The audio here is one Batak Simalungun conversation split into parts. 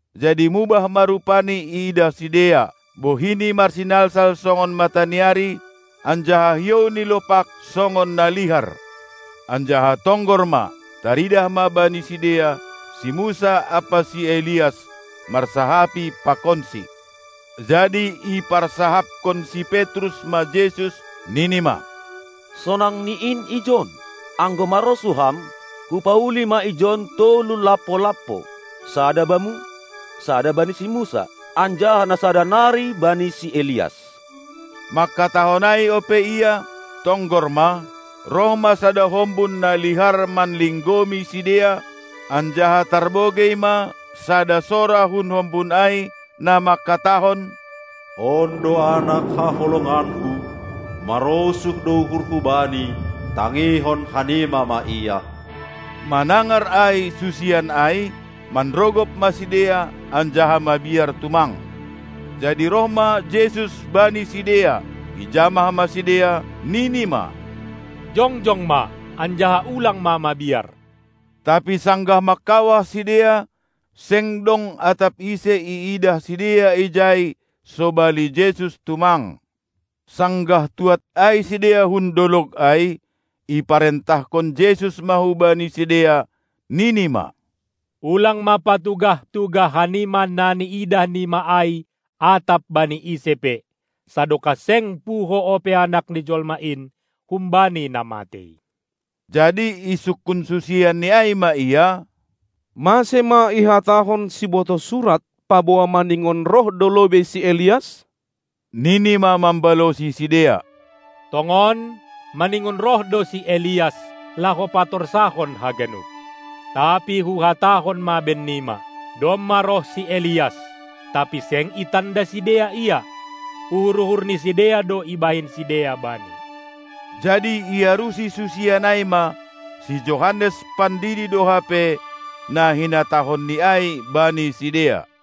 Jadi mubah ma rupaNi iidah sidea, bohiNi marsinalsal songon mataniari, anjaha hiouNi lopak songon na lihar. Anjaha tonggor ma, taridah ma bani sidea si Musa ampa si Elias, marsahapi pakonSi. Jadi iparsahapkon si Petrus ma Jesus, nini ma: Sonang ni in ijon! Anggo marosuh Ham, hupauli ma ijon tolu lampo-lampo, sada Bamu, sada bani si Musa, anjaha na sada nari bani si Elias. Mangkatahon ai ope ia, tonggor ma, roh ma sada hombun na lihar manlinggomi sidea, anjaha tarbogei ma sada sora hun hombun ai, na mangkatahon: On do Anak haholonganKu, marosuh do uhurHu Bani, tangihon hanima ma Ia! Manangar ai susian ai, manrogop ma sidea anjaha mabiar tumang. Jadi roh ma Jesus bani sidea, ijamah ma sidea, nini ma: Jongjong ma, anjaha ulang ma mabiar! Tapi sanggah mangkawah sidea, seng dong atap ise iidah sidea ijai sobali Jesus tumang. Sanggah tuad ai sidea hun dolog ai, iparentahkon Jesus ma hubani sidea, nini ma: Ulang ma patugah-tugah hanima na niidahnima ai atap bani ise pe, sadokah seng puho ope Anak ni jolma in humbani na matei. Jadi isungkun susianNi ai ma Ia: Mase ma ihatahon sibotoh surat paboa maningon roh do lobei si Elias? Nini ma mambalosi sidea: Tongon, maningon roh do si Elias, laho patorsahon haganup. Tapi Huhatahon ma bennima: Domma roh si Elias, tapi seng itanda sidea ia; uhur-uhur ni sidea do ibahen sidea bani. Jadi iarusi susian ai ma, si Johannes Pandidi do hape, na hinatahonNi ai bani sidea.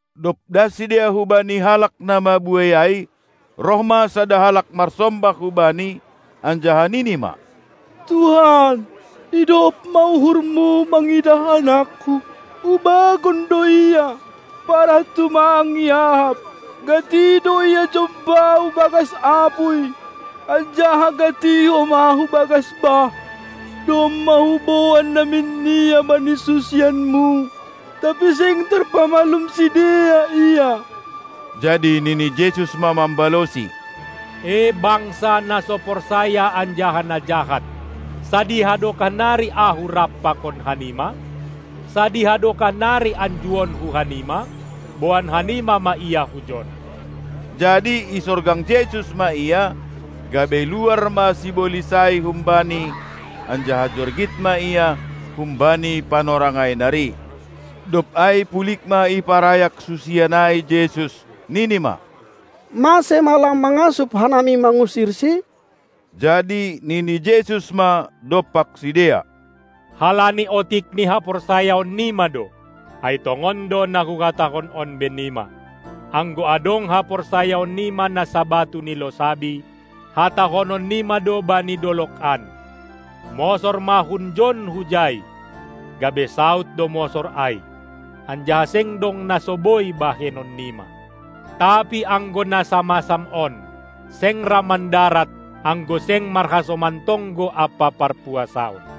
Dob das sidea hubani halak na mabuei ai, roh ma sada halak marsombah hu Bani, anjaha nini ma: Tuhan, idop ma uhurMu mangidah anakku. Ubagon do ia, parah tumang iahap. Gati do ia jomba hu bagas apuy, anjaha gati homa hu bagas bah. Domma huboan namin ia bani susianMu, tapi seng tarpamalum sidea ia. Jadi nini Jesus ma mambalosi: E bangsa, na so porsaya anjaha na jahat! Sadiha dokah nari Ahu rap pakon hanima? Sadiha dokah nari anjuonKu hanima? Boan hanima ma ia hujon. Jadi isorgang Jesus ma ia, gabe luar ma sibolis ai humbani, anjaha jorgit ma ia humbani panorang ai nari. Dob ai pulig ma iparayak susian ai Jesus, nini ma: Mase ma lang mangasup hanami mangusirsi? Jadi nini Jesus ma dompak sidea: Halani otik ni haporsayaonnima do! Ai tongon do na Huhatahon on bennima: Anggo adong haporsayaonnima na sabatu ni losabi, hatahononnima do bani dolog an: Mosor ma hunjon hujai, gabe saud do mosor ai, anjaha seng dong na so boi bahenonnima. Tapi anggo na samasam on, seng ra mandarat, anggo seng marhasoman tonggo ampa parpuasaon.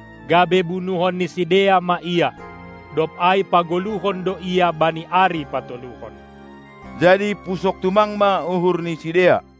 gabe bunuhon ni sidea ma Ia, dob ai pagoluhon do Ia bani ari patoluhon. Jadi pusok tumang ma uhur ni sidea.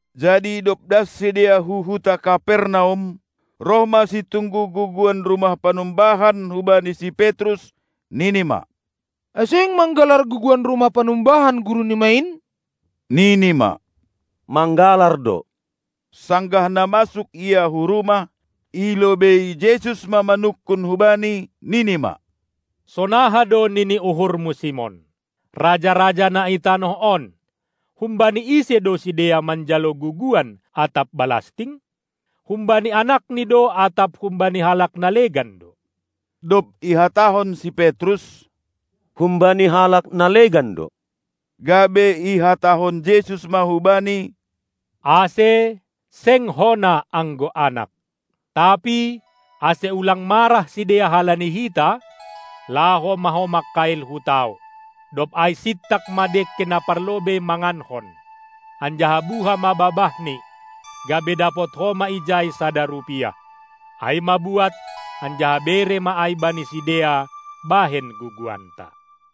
Jadi dob das sidea hu huta Kapernaum, roh ma situnggu guguan rumah panumbahan hubani si Petrus, nini ma: Ai seng manggalar guguan rumah panumbahan Gurunima in? Nini ma: manggalar do. Sanggah na masuk ia hu rumah, i lobeii Jesus ma manungkun hubani, nini ma: Sonaha do nini uhurmu, Simon? Raja-raja na itanoh on, humbani ise do sidea manjalo guguan atap balasting? Humbani anakni do atap humbani halak na legan do? Dob ihatahon si Petrus: "Humbani halak na legan do", gabe ihatahon Jesus ma hubani: "Ase, seng hona anggo anak!" Tapi, ase ulang marah sidea halani hita, laho ma ho mangkail hu tao, dob ai sintak ma dengke na parlobei mangankon, anjaha buha ma babahni, gabe dapot ho ma ijai sada rupiah. Ai ma buat, anjaha bere ma ai bani sidea bahen guguanta.